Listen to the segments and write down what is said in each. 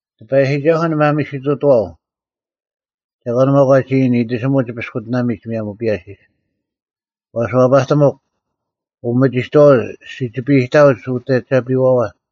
ᑎᐸᔨᒋᒐᓱᐤ ᓂ ᒪᒥᓯᑐᑐᐛᐤ; ᒐᒂᓐ ᒪᒃ ᐛᒋ ᐃᓯᔨᓐ, “ᐃᑎᓯᒧᐤ ᒋ ᐱᔅᑯᑎᓇᒥᒡ ᒧᔭᒻ ᐱᔭᓯᔅ?” ᐛᔅ, ᐛᐸᑎᒥᒄ, ᐅᒥᒋᑥᐅᒡ ᓯᒋᐱᑕᐅᒡ ᐅᑦ ᐊᒐᐱᐛᐛ,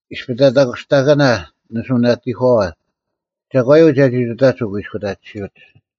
ᐃᔅᐱ ᑕᑕᔅᑯᔅᑕᑭᓇ ᓂᓱᐛᓇᑎᒂᐛ, ᒐᒂᔪᐤ ᒐᒋ ᑐᑕᒡ ᐅᑯᐃᔅᑯᑕᑎᓯᐅᒡ?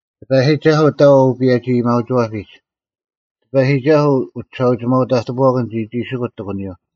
ᑎᐸᔨᒋᒐᓱᐤ ᑕᐤ ᐅᐸᔭᒋ-ᐊᔭᒥᐊᐅᒋᐛᐱᒡ, ᑎᐸᔨᒋᒐᓱᐤ ᐅᒋᓴᐅᒋᒪᐤ ᑕᑎᐳᐛᑭᓐ ᒋᒋᒋᓯᑯᒡ ᑎᒂᓂᔪᐤ: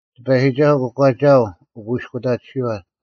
ᑎᐸᔨᒋᒐᓱᐤ ᑯᒂᒋᐊᐤ ᐅᑯᐃᔅᑯᑕᑎᓯᐛ: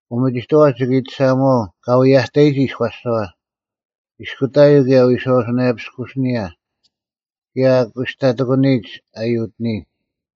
ᐅᒪᒋᑥᐛ ᒋᑭ ᐃᑎᓴᒧᐛᐤ ᑲ ᐛᔭᑕᔨᒋ ᐃᔎᔅᒐᐛ, ᐃᔅᑯᑕᔪᐤ ᑭᔭ ᐎᔄᐛᐱᔅᑯᓯᓂᔭ, ᑭᔭ ᐊ ᑯᔅᑕᑎᑯᓂᔨᒡ ᐊ ᔪᑎᓂᔨᒡ: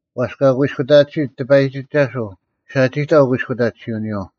ᐛᔅ ᑲ ᑯᐃᔅᑯᑕᑎᓯᑦ ᑎᐸᔨᒋᒐᓱᐤ ᓴᒋᑕᐤ ᑯᐃᔅᑯᑕᑎᓯᐅᓂᔪᐤ;